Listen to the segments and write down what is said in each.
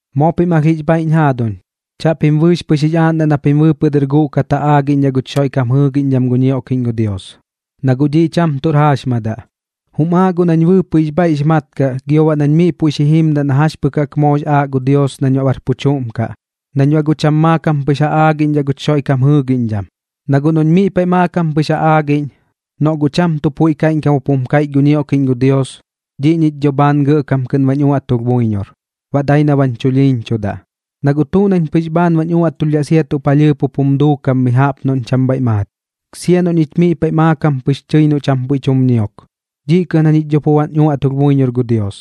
Moo pim alh jix bhaiꞌñ jaaduñ, chaꞌpim bɨɨx pɨx jix aaꞌndaꞌ na pim bɨɨpɨꞌ dɨr guꞌkat ja aagiꞌñdhaꞌ guch Xoiꞌkam jɨɨgiꞌñdham gu ñioꞌkiꞌñ gu Dios, na guꞌ dhiꞌ cham tuꞌr jaaxmadaꞌ. Jum aaꞌ guꞌ nañ bɨɨpɨꞌ jix bhaiꞌx mat kaꞌ gio baꞌ nañ miꞌ puiꞌ xi jimdaꞌ na jax pɨk jaꞌk moox aaꞌ gu Dios nañ baꞌ bar pu chuꞌm kaꞌ, nañ baꞌ guꞌ cham maakam pɨx ja aagiꞌñdhaꞌ guch Xoiꞌkam jɨɨgiꞌñdham. Na guꞌ noꞌñ miꞌ paiꞌ maakam pɨx ja aagiꞌñ, noꞌ guꞌ cham tuꞌ puiꞌ kaiꞌñkam jup jum kaiꞌch gu ñioꞌkiꞌñ gu Dios, dhiꞌ ñich dho bhaan gɇꞌkam kɨꞌn bañ uaꞌtulh buiñor, baꞌ dai na bañ chulhiiñchudaꞌ. Na guꞌ tuꞌ nañ pɨx bhaan bañ uaꞌtulhdhaꞌ sia tuꞌ palhɨɨp jup jum duukam mi jaꞌp noꞌñ cham bhaiꞌ maat, sia noꞌ ñich miꞌ paiꞌ maakam pɨx tɨi na cham puiꞌ tum ñiok, dhiꞌ kɨꞌn jañich dho pu bañ uaꞌtulh buiñor gu Dios.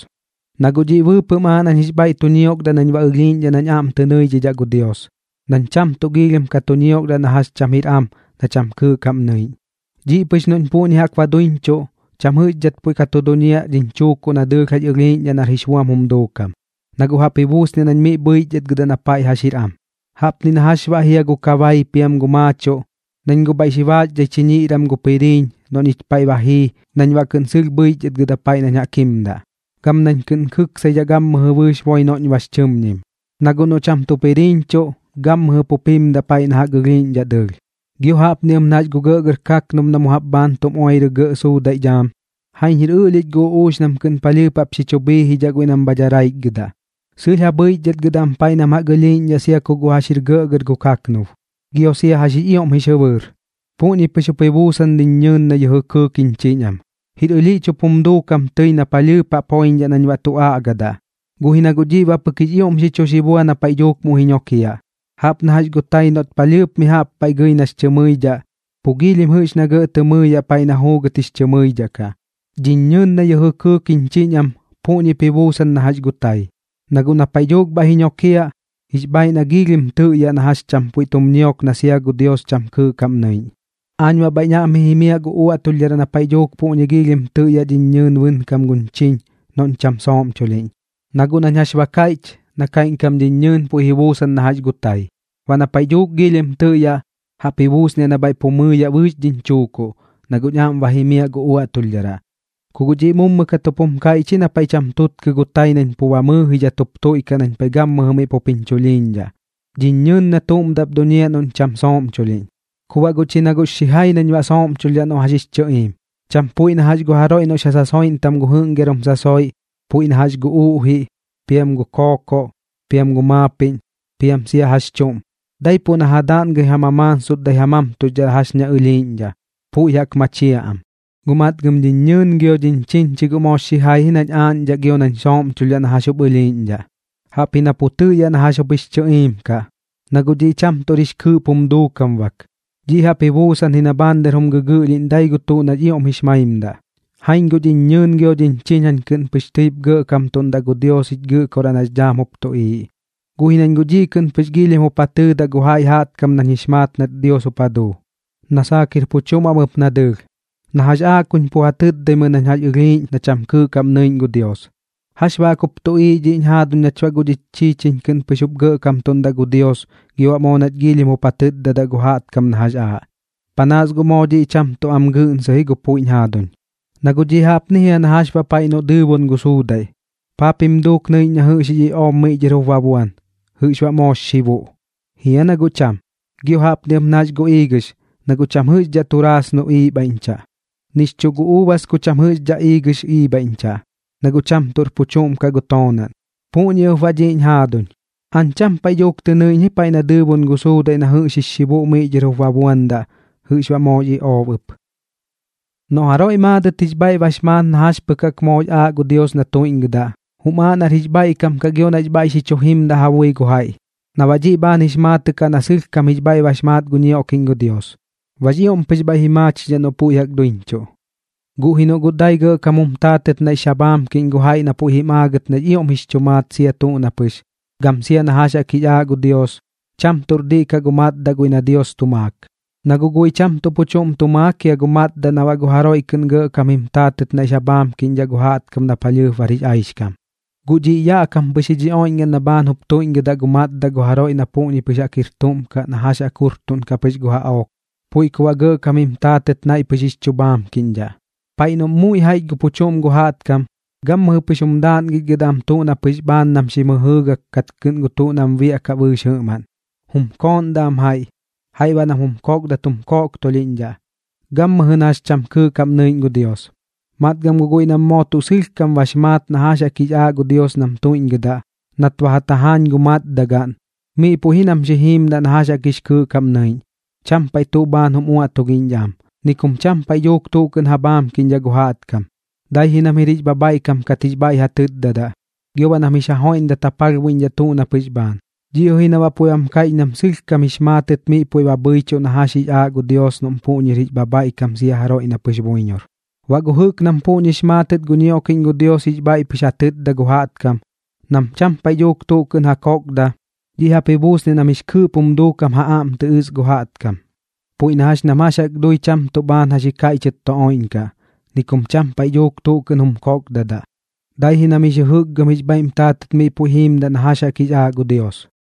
Na guꞌ dhiꞌ bɨɨpɨꞌm aaꞌ nañ jix bhaiꞌ tu ñiokdaꞌ nañ baꞌ ɨlhiiꞌñdhaꞌ nañ aꞌm tɨ nɨidhidhaꞌ gu Dios, nañ cham tuꞌ giilhim ka tu ñiokdaꞌ na jax cham jir am na cham kɨɨꞌ kaꞌm nɨiꞌñ. Dhiꞌ pɨx noꞌñ puꞌñi jaꞌk ba duiñchuꞌ, cham jɨꞌxdhat puiꞌ ka tu duñiaꞌ dhiñ chuukuꞌ na dɨɨlh jax ɨlhiiꞌñdhaꞌ nar jix buam jum duukam, na guꞌ jaꞌp ji buusniaꞌ nañ miꞌ bhɨichdhatgɨdaꞌ na paiꞌ jax jir am. Jaꞌpni na jax baꞌ jia gu kabai piam gu tuꞌ maachuꞌ, nañ guꞌ bhaiꞌ xi baaxdhai chiñiꞌram gu piriiñ noꞌ ñich paiꞌ ba jii nañ baꞌ kɨꞌn sɨlh bhɨichdhatgɨdaꞌ paiꞌ nañ jaꞌk jimdaꞌ, gam nañ kɨꞌn kɨksaidhaꞌ gammɨjɨ bɨɨx boi noꞌñ bax chɨmñim. Na guꞌ noꞌ cham tu piriiñchuꞌ, gammɨjɨ pup jimdaꞌ paiꞌ na jaꞌk ɨlhiiꞌñdhaꞌ dɨɨlh. Gio jaꞌpni ɨp na jax gu gɇꞌgɇr kaknub na mu jaꞌp bhaan tum oirɨ gɇꞌ suudaiꞌ dhaam. Jaiñ jir ɨꞌlhich gu uꞌuux nam kɨꞌn palhɨɨp jax xi chu bhiijidhaꞌ guiꞌ nam bha daraichgɨdaꞌ, sɨlh ja bhɨichdhatgɨdaꞌ am paiꞌ nam jaꞌk ɨlhiiꞌñdhaꞌ sia ku guꞌ jax jir gɇꞌgɇr gu kaknub, gio sia jax jix ioꞌm jix jɨbɨɨr. Puꞌñi pɨx jup ji buusan dhiñ ñɨɨn na yɨjɨ kɨɨk jiñ chiñ am, jir ɨlhiꞌch jup jum duukam tɨi na palhɨɨp jaꞌp joiñdhaꞌ nañ baꞌ tu aꞌgadaꞌ. Guꞌ ji na guꞌ dhiꞌ baꞌ pɨk jix ioꞌm xi chu xi bua na paiꞌ dhuuk muiꞌ ji ñokiaꞌ, jaꞌp na jax gu tai noꞌt palhɨɨp mi jaꞌp paiꞌ gɨi nax chɨ mɨidhaꞌ, pu giilhim jɨꞌx na gɇꞌ tɨ mɨɨyaꞌ paiꞌ na juugɨt jix chɨ mɨidhaꞌ kaꞌ. Dhiñ ñɨɨn na yɨjɨ kɨɨk jiñ chiñ am, puꞌñip ji buusan na jax gu tai, na guꞌ na paiꞌ dhuuk bhaiꞌ ji joñiaꞌ, jix bhaaiꞌ na giilhim tɨꞌyaꞌ na jax cham puiꞌ tum ñiok na sia gu Dios cham kɨɨꞌ kaꞌm nɨiꞌñ. Aañ baꞌ bhaiꞌñ aꞌm ji jimiaꞌ gu uaꞌtulhdharaꞌ na paiꞌ dhuuk puꞌñi giilhim tɨꞌyaꞌ dhiñ ñɨɨn bɨnkam guñ chiñ noꞌñ cham sooꞌmchulhiꞌñ, na guꞌ nañ jax ba kaiꞌch, na kaiꞌñkam dhiñ ñɨɨn puiꞌ ji buusan na jax gu tai. Baꞌ na paiꞌ dhuuk giilhim tɨꞌyaꞌ, jaꞌp ji buusniaꞌ na bhaiꞌ pu ji mɨɨyaꞌ bɨɨx dhiñ chuukuꞌ, na guꞌñ aꞌm ba jimiaꞌ gu uaꞌtulhdharaꞌ. Ku guꞌ dhiꞌ mummu kat jup jum kaiꞌch ji na paiꞌ cham tutkɨ gu tai nañ pu ba mɨɨjidhat jup tuiꞌkaꞌ nañ paiꞌ gammɨjɨ miꞌ pup jiñ chulhiiñdhaꞌ, dhiñ ñɨɨn na tuꞌm daꞌp duñiaꞌ noꞌñ cham sooꞌmchulhiꞌñ. Ku baꞌ guꞌ chi na guꞌx xijai nañ baꞌ sooꞌmchulhdhaꞌ noꞌ jax jix chɨꞌiim, cham puiꞌ na jax gu jaroiꞌ noꞌx ja sasoiꞌntam gu jɨꞌngiarum sasoiꞌ, puiꞌ na jax gu uꞌjiꞌ, piam gu kookoꞌ, piam gu maapiꞌñ, piam sia jax chuꞌm, daipuꞌ na ja daꞌngɨi ja mamaansutdai ja mamtuxdhaꞌ jax ña ɨlhiiꞌñdhaꞌ, puiꞌ jaꞌk machiaꞌ am. Guꞌ matgam dhiñ ñɨɨn gio dhiñ chiñ chi guꞌ moox xijai ji nañ aaꞌñdhaꞌ gio nañ sooꞌmchulhdhaꞌ na jax jup ɨlhiiꞌñdhaꞌ, jaꞌpji na pu tɨꞌyaꞌ na jax jup jix chɨꞌiim kaꞌ, na guꞌ dhiꞌ cham tuꞌr jix kɨɨꞌp jum duukam bak. Dhiꞌ jaꞌp ji buusan ji na bhaan dɨr jum gɨgɨꞌlhiꞌñ dai gu tuꞌ nax ioꞌm jix maimdaꞌ. Jaiñ guꞌ dhiñ ñɨɨn gio dhiñ chiñ jañ kɨꞌn pɨx jup gɇꞌkamtuꞌndaꞌ tɨi gu Dios jich Gɨꞌkoraꞌ nax dhaam jup tuꞌiiꞌ, guꞌ ji nañ guꞌ dhiꞌ kɨꞌn pɨx giilhim jup ja tɨɨdaꞌ gu jaiꞌ jaꞌtkam nañ jix maat nat Dios jup ja duu, na saak jir pu chuꞌm am ɨp na dɨɨlh, na jax aaꞌ kuñ pu ja tɨtdaimɨi nañ jax ɨlhiiꞌñ na cham kɨɨꞌ kaꞌm nɨiꞌñ gu Dios. ¿Jax baꞌ jaꞌk jup tuꞌiiꞌ dhiꞌñ jaaduñ nach baꞌ guꞌ dhich chiichiñ kɨꞌn pɨx jup gɇꞌkamtuꞌndaꞌ gu Dios gio baꞌ moo nach giilhim jup ja tɨtdadaꞌ gu jaꞌtkam na jax aaꞌ? Panaas guꞌ moo dhiꞌ cham tuꞌ am gɨꞌnsɨ ji gu puiꞌ jiñ jaaduñ. Na guꞌ dhiꞌ jaꞌpni jia na jax baꞌ paiꞌ noꞌ dɨɨbon gu suudaiꞌ, ¿paa pim duuk nɨiꞌñ na jɨꞌx jix iꞌoob miꞌ dhɨr jup ba buan, jɨꞌx baꞌ moox xibuꞌ? ¿Jia na guꞌ cham? Gio jaꞌpni ɨp na jax gu iigɨx, na guꞌ cham jɨꞌxdhaꞌ turaasno iibhaiꞌñchaꞌ, nix chuꞌ gu uubas ku cham jɨꞌxdhaꞌ iigɨx iibhaiꞌñchaꞌ, na guꞌ cham tuꞌr pu chuꞌm kaꞌ gu toonaꞌn. Puꞌñi ɨp baꞌ dhiꞌñ jaaduñ, aañ cham paiꞌ dhuuk tɨ nɨiꞌñ ji paiꞌ na dɨɨbon gu suudaiꞌ na jɨꞌx jix xibuꞌ miꞌ dhɨr jup ba buandaꞌ, jɨꞌx baꞌ moox iꞌoob ɨp. Noꞌ jaroiꞌ maadɨt jix bhaiꞌ bax maat na jax pɨk jaꞌk moox aaꞌ gu Dios na tuiꞌñgɨdaꞌ, jum aaꞌ nar jix bhaiꞌkam kaꞌ gio nax bhaiꞌ xi chu jimdaꞌ ja bui gu jaiꞌ, na baꞌ dhiꞌ bhaan jix maatɨꞌ kaꞌ na sɨlhkam jix bhaiꞌ bax maat gu ñioꞌkiꞌñ gu Dios. Baꞌx ioꞌm pɨx bhaiꞌ ji maachidhaꞌ noꞌ puiꞌ jaꞌk duiñchuꞌ. Guꞌ ji noꞌ guꞌ dai gɇꞌkam jum taatɨt naiꞌx ja bhaamkiꞌñ gu jaiꞌ na puiꞌ jim aagɨt nax ioꞌm jix chu maat sia tuꞌ na pɨx, gam sia na jax jaꞌk jix aaꞌ gu Dios, cham tuꞌr diꞌ kaꞌ gu matdaꞌ guiꞌ na Dios tu maak. Na guꞌ guiꞌ cham tuꞌ pu chuꞌm tu maak jia gu matdaꞌ na baꞌ gu jaroiꞌ kɨꞌn gɇꞌkam jim taatɨt naiꞌx ja bhaamkiꞌñdhaꞌ gu jaꞌtkam na palhɨɨp bar jix aixkam. Guꞌ dhiꞌ yaꞌ kam pɨx ji dhi oiꞌñgaꞌn na bhaan jup tuiꞌñgɨdaꞌ gu matdaꞌ gu jaroiꞌ na puꞌñi jaꞌk pɨx jir tuꞌm kaꞌ na jax jaꞌk jurtuꞌnkaꞌ pɨx gu jaꞌook, puiꞌ ku baꞌ gɇꞌkam jim taatɨt naiꞌ pɨx jix chu bhaamkiꞌñdhaꞌ. Paiꞌ noꞌm muiꞌ jaiꞌch gu pu chuꞌm gu jaꞌtkam, gammɨjɨ pɨx jum daaꞌngichgɨdaꞌ am tuꞌ na pɨx bhaan nam xim jɨjɨɨgak kat kɨꞌn gu tuꞌ nam biaꞌkaꞌ bɨɨx jɨꞌmaꞌn. Jum kooꞌndaꞌ am jaiꞌ, jaiꞌ baꞌ nam jum kokdadat jum koꞌktolhiꞌñdhaꞌ, gammɨjɨ na jax cham kɨɨꞌ kaꞌm nɨiꞌñ gu Dios. Matgam guꞌ guiꞌ nam moo tuꞌ sɨlhkam bax maat na jax jaꞌk jix aaꞌ gu Dios nam tuiꞌñgɨdaꞌ, nat ba ja tajaañ gu matdagaꞌn, miꞌ puiꞌ ji nam xi jiimdaꞌ na jax jaꞌk jix kɨɨꞌ kaꞌm nɨiꞌñ. Cham paiꞌ tuꞌ bhaan jum uaꞌtulhiꞌñdhaꞌ am, ni kum cham paiꞌ dhuuk tuꞌ kɨꞌn ja bhaamkiꞌñdhaꞌ gu jaꞌtkam, dai ji nam jir jix bhabhaiꞌkam kat jix bhaiꞌ ja tɨtdadaꞌ, gio baꞌ nam jix ja joiꞌmdat ja palhbuiꞌñdhaꞌ tuꞌ na pɨx bhaan. Dhiꞌ jɨꞌ ji na baꞌ puiꞌ bam kaiꞌch nam sɨlhkam jix maatɨt miꞌ puiꞌ ba bhɨichuꞌ na jax jaꞌk jix aaꞌ gu Dios noꞌm puꞌñir jix bhabhaiꞌkam sia jaroiꞌ na pɨx buiñor. Baꞌ gu jɨꞌk nam puꞌñi jix maatɨt gu ñioꞌkiꞌñ gu Dios jix bhaiꞌ pɨx ja tɨtdaꞌ gu jaꞌtkam, nam cham paiꞌ dhuuk tuꞌ kɨꞌn ja kokda, dhiꞌ jaꞌp ji buusniaꞌ nam jix kɨɨꞌp jum duukam ja aꞌm tɨ ɨs gu jaꞌtkam. Puiꞌ na jax nam jax jaꞌk dui cham tuꞌ bhaan jax ji kaiꞌchɨt tu oiꞌñkaꞌ, ni kum cham paiꞌ dhuuk tuꞌ kɨꞌn jum kokdadaꞌ, dai ji nam jix jɨjɨkgɨm jix bhaiꞌm taatɨt miꞌ puiꞌ jiimdaꞌ na jax jaꞌk jix aaꞌ gu Dios.